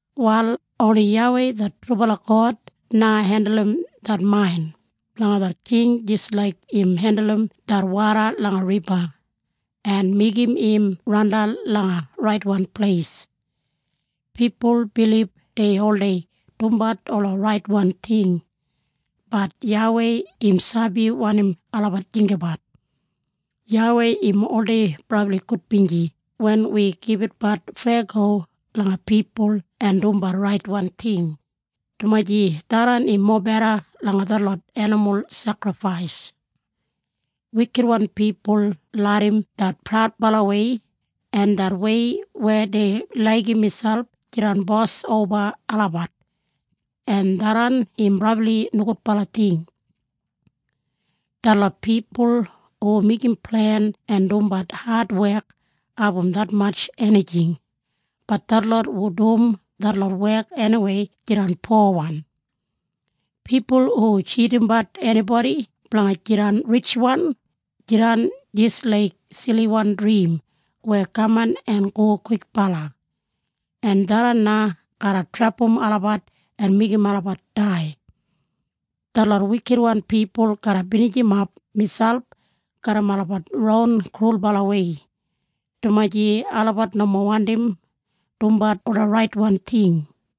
Wal oni YAWEI det trubala God na hendulum det main blanga det king jis laik im hendulum det woda langa riba en meigim im randan langa raitwan pleis. Pipul bilib dei oldei dumbat ola raitwan ting, bat YAWEI im sabi wanim olabat jinggabat. YAWEI im oldei brabli gudbinji wen wi gibitbat feyago langa pipul en dumbat raitwan ting, dumaji tharran im mobeda langa detlot enimul sekrifais. Wikitwan pipul larram det praudbalawei en det wei weya dei laigim miselp jidan bos oba olabat, en tharran im brabli nogudbala ting. Detlot pipul hu meigim plen en dumbat adwek abum detmatj enijing, bat detlot hu dum detlot wek eniwei jidan powan. Pipul hu tjidimbat enibodi blanga jidan ritjwan, jidan jis laik siliwan drim weya kaman en go kwikbala, en tharran na garra trepam olabat en meigim olabat dai. Detlot wikitwan pipul garra binijimap miselp garram olabat ron krulbalawei, dumaji olabat nomo wandim dumbat ola raitwan ting.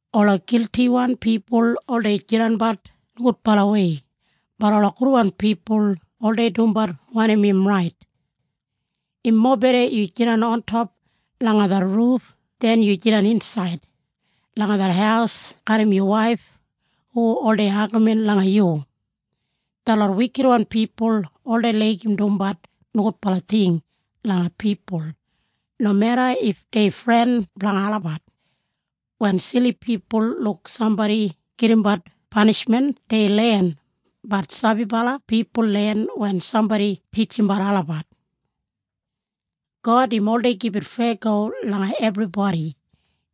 Ola giltiwan pipul oldei jidanbat nogudbalawei, bat ola gudwan pipul oldei dumbat wanim im rait. Im mobeda yu jidan ontop langa det ruf den yu jidan insaid langa det haus garram yu waif hu oldei agamin langa yu. Detlot wikitwan pipul oldei laigim dumbat nogudbala ting langa pipul, nomeda if dei fren blanga olabat. Wen sili pipul luk sambodi gedimbat panishmen dei len, bat sabibala pipul len wen sambodi titjimbat olabat. God im oldei gibit feyago langa ebribodi.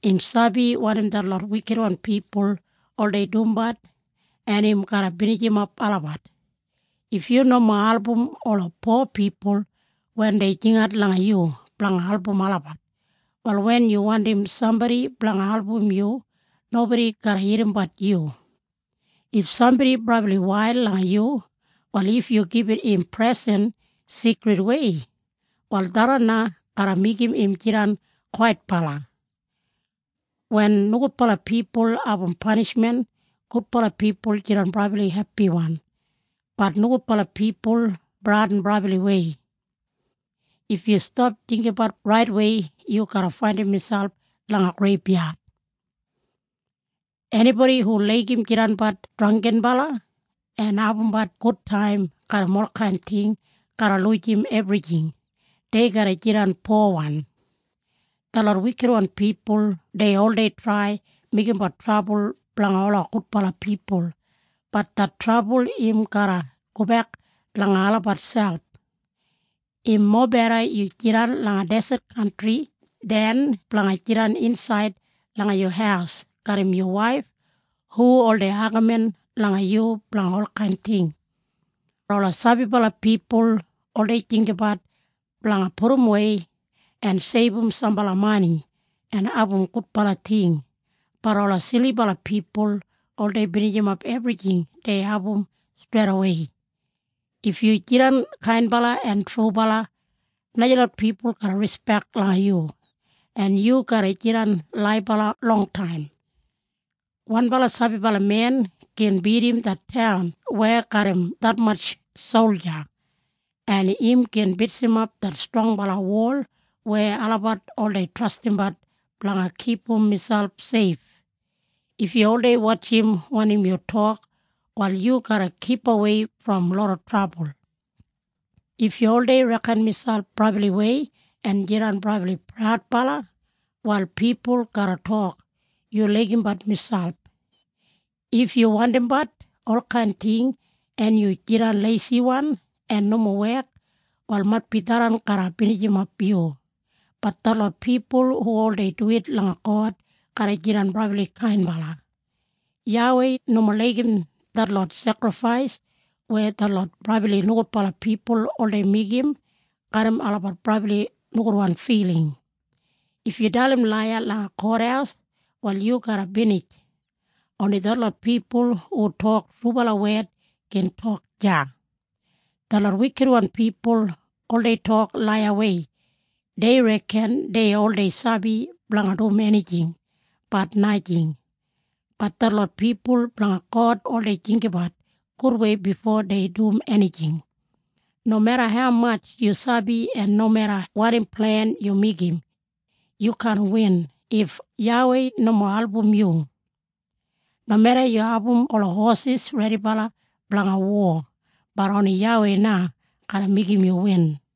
Im sabi wanim detlot wikitwan pipul oldei dumbat en im garra binijimap olabat. If yu nomo album ola po pipul wen dei jingat langa yu blanga album olabat, wal wen yu wandim sambodi blanga album yu nobodi garra irrimbat yu. If sambodi brabli wail langa yu, wal if yu gibit im presen sigridwei, wal tharran na garra meigim im jidan kwaitbala. Wen nogudbala pipul abum panishmen, gudbala pipul jidan brabli hepiwan, bat nogudbala pipul bradin brabliwei. If yu stap jinggabat raitwei yu garra faindim miselp langa greibyad. Enibodi hu laigim jidanbat drangginbala en abumbat gudtaim garram olkain ting garra lujim ebrijing. Dei garra jidan powan. Detlot wikitwan pipul dei oldei trai meigimbat trabul blanga ola gudbala pipul, bat det trabul im garra gobek langa olabat selp. Im mobeda yu jidan langa deset kantri den blanga jidan insaid langa yu haus garram yu waif hu oldei agamin langa yu blanga olkain ting. Ola sabibala pipul oldei jinggabat blanga pudumwei en seibum sambala mani en abum gudbala ting, bat ola silibala pipul oldei binijimap ebrijing dei abum streidawei. If yu jidan kainbala en trubala, najalot pipul garra rispek langa yu, en yu garra jidan laibala longtaim. Wanbala sabibala men gin bidim det taun weya garram detmatj solja, en im gin bitsimap det strongbala wol weya olabat oldei trastimbat blanga kipum miselp seif. If yu oldei wotjim wanim yu tok, wal yu garra kipawei brom loda trabul. If yu oldei reken miselp brabliwei en jidan brabli praudbala, wal pipul garra tok, “Yu laigimbat miselp!” If yu wandimbat olkain ting en yu jidan leisiwan en nomo wek, wal maitbi tharran garra binijimap yu. Bat detlot pipul hu oldei duwit langa God garra jidan brabli kainbala. YAWEI nomo laigim detlot sekrifais weya detlot brabli nogudbala pipul oldei meigim garram olabat brabli nogudwan filing. If yu dalim laiya langa kothaus wal yu garra binij. Oni detlot pipul hu tok trubala wed gin tok deya. Detlot wikitwan pipul oldei tok laiyawei. Dei reken dei oldei sabi blanga dum enijing, bat najing. Bat detlot pipul blanga God oldei jinggabat gudwei bifo dei dum enijing. Nomeda haumatj yu sabi en nomeda wanim plen yu meigim, yu kaan win if YAWEI nomo album yu. Nomeda yu abum ola hosis redibala blanga wo, bat oni YAWEI na garra meigim yu win.